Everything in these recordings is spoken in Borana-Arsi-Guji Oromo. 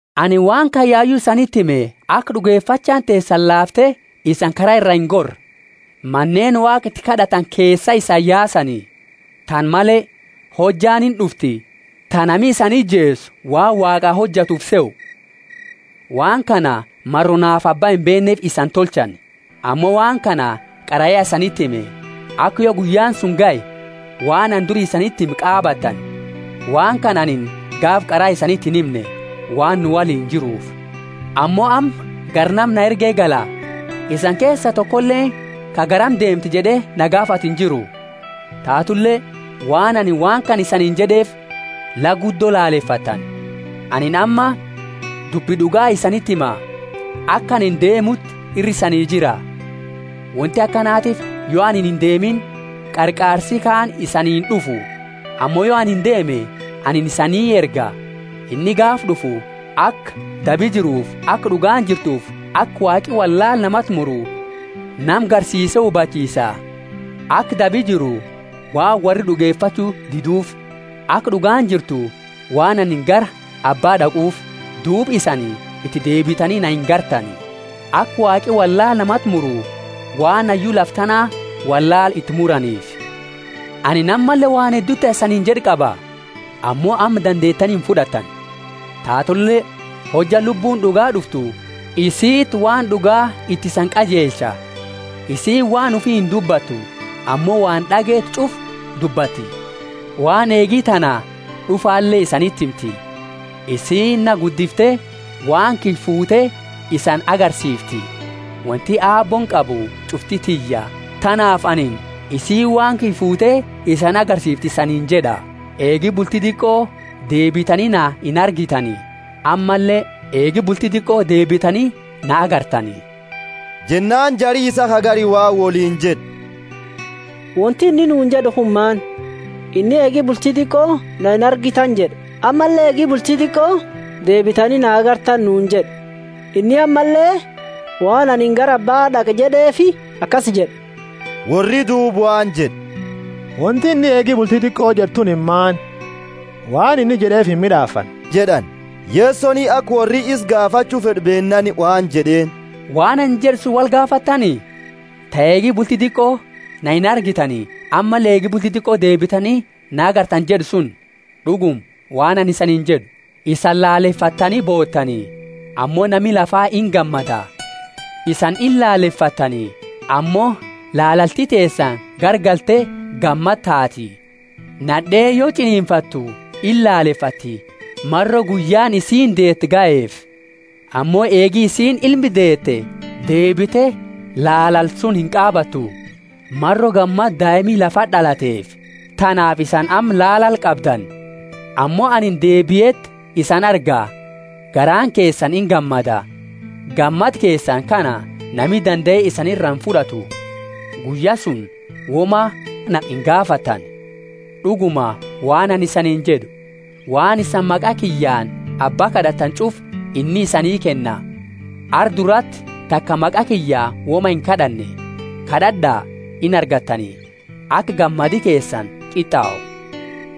Anini waan kana yayu isaniti hime aka d'ugefachaani teesani laafte isaani kara iraa ingorre. Maneeni Waaqa iti kad'atani keesaa isani yaasani. Tana male, hojjaani ind'ufti ta nami isani ijeesu waan Waaqaa hojatu ufi sehu. Waan kana maro naafi Abba imbeenneefi isani tolchani. Ammo waan kana qara ya isaniti hime, aka yo guyyaani suni gahe, waan anini duri isaniti hime qaabattani. Huji Lubbu Qulqullo Waan kana anini gaafa qara isaniti inhimne, waan nu woliini jiruufi. Ammo amma gara nama na erge gala; isani keesa tokoleeni ka, Garami deemta? jed'e na gaafatu injiru. Taatule waan anini waan kana isaniini jed'eefi, la guddo lalefattani. Anini ammo dubbi d'uga isaniti hima: aka anini deemuti ira isani jira. Wonti akanatiifi yo anini indeemini, Qarqaarsi kaani isanii ind'ufu. Ammo yo anini deeme, anini isa isanii erga. Inni gaafa d'ufu, aka dabi jiruufi aka d'ugaani jirtuufi aka Waaqi wollaala namaati muru nama garsiise hubachiisa. Aka dabi jiru, waan worri d'ugefachu diduufi; aka d'ugaani jirtu, waan anini gara Abba d'aquufi, duuba isani iti deebitani na inargitani; aka Waaqi wollaala namati muru, waan hayyu lafa tana wollaala iti muraniifi. Anini ammalle waan heddu ta isaniini jed'u qaba, ammo amma dandeetani imfud'attani. Taatule hojja Lubbuuni d'ugaa d'uftu, isiiti waan d'ugaa iti isani qajeelcha. Isiini waan ufi indubbatu, ammo waan d'ageete ch'ufa dubbatti, waan eegi tana d'ufale isaniti himti. Isiini na guddifte waan kiyya fuute isani agarsiifti. Wonti Aabbooni qabu ch'ufti tiyya; tanaafi anini, isiini waan kiyya fuute isani agarsiifti isaniini jed'a. Eegi bulti diqo deebitani na inargitani; ammalle eegi bulti diqo deebitani na agartani. Jennaani jari isaa ka gari waan woliini jed'e, Wonti inni nuuni jed'u kunini maani? Inni, eegi bulti diqo na inargitani jed'a ammalle eegi bulti diqo deebitani na agartani nuuni jed'a, inni ammalle, waan anini gara Abbaa d'aqa jed'eefi akasi jed'e? Worri duuba waan jed'e, Wonti inni, Eegi buti diqo jed'e tunini maani? Waan inni jed'eefi imid'aafanne jed'ani. Yesoni aka worri isa gaafachu fed'u beennaani waan jed'eeni, Waan anini jed'e suni wolgaafattani? Ta, Eegi bulti diqo na inargitani, ammalle, Eegi bulti diqo deebitani na agartani jed'e suni? D'uguma, waan anini isaniini jed'u, Isani laalefattani bootani, ammo nami lafa igammada; isani ilaalefattani, ammo lalalti teesani garagalte gammada taati. Nad'eeni yo ch'ininfattu ilaalefatti, maro guyyaani isiini deetu gaheefi. Ammo eegi isiini ilme deete, deebite lalala suni inqaabattu, maro gammada daima lafati d'alteefi. Tanaafi isani amma lalala qabdani, ammo anini deebieti isani arga, garaani keesani ingammada, gammada keesani kana nami dandae isani ira imfud'atu. Guyya suni woma na ingaafattani. D'uguma, waan anini isaniini jed'u, Waan isani maqa kiyyaani Abba kad'attani ch'ufa inni isanii kenna. Arra durati taka maqa kiyyaani woma inkad'anne; kad'ad'a, inargattani, aka gammadi keesani qit'au.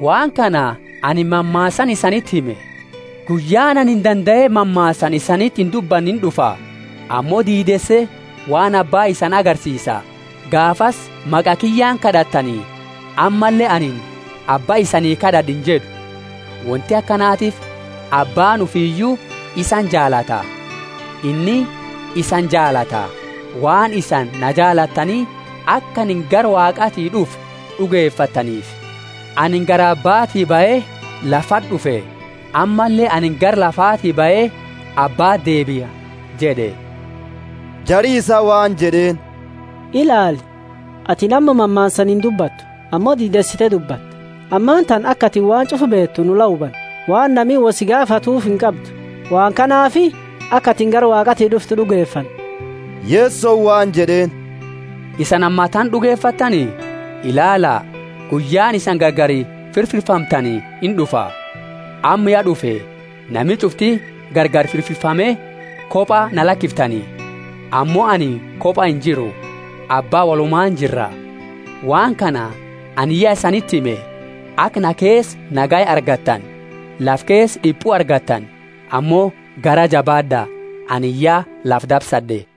Waan kana anini mammaasaani isaniti hime. Guyyaani anini dandae mammaasaani isaniti indubbanne ind'ufa, ammo diideese waan Abba isani agarsiisa. Gaafasi maqa kiyyaani kad'attani; ammalle anini, Abba isanii kad'ad'a injed'u; wonti akanatiifi Abbaani ufiyu isani jaalata. Inni isani jaalata, waan isani na jaalattani aka anini gara Waaqaati d'ufe d'ugefattaniifi. Anini gara Abbati bahe lafati d'ufe; ammalle anini gara lafaati bahe Abbati deebia jed'e. Jari isaa waan jed'eeni, Ilaali, ati amma mammaasaani indubbattu ammo diideesite dubbatta. Ammatana aka ati waan ch'ufa beetu nu la hubanne; waan nami wo si gaafatuufi inqabdu. Waan kanaafi aka atini gara Waaqaati d'ufte d'ugefanna. Yesoni waan jed'eeni, Isani ammatana d'ugefattani? Ilaala, guyyaani isani gargari firfirfamtani ind'ufa, amma ya d'ufe; nami ch'ufti gargari firfirfame, koba na lakiftani. Ammo anini koba injiru; Abba wolumaani jirra. Waan kana anini ya isaniti hime, aka na keesa nagaya argattani. Lafa keesa d'ipu argattani, ammo garaa jabaad'a! Anini ya lafa dabsad'e.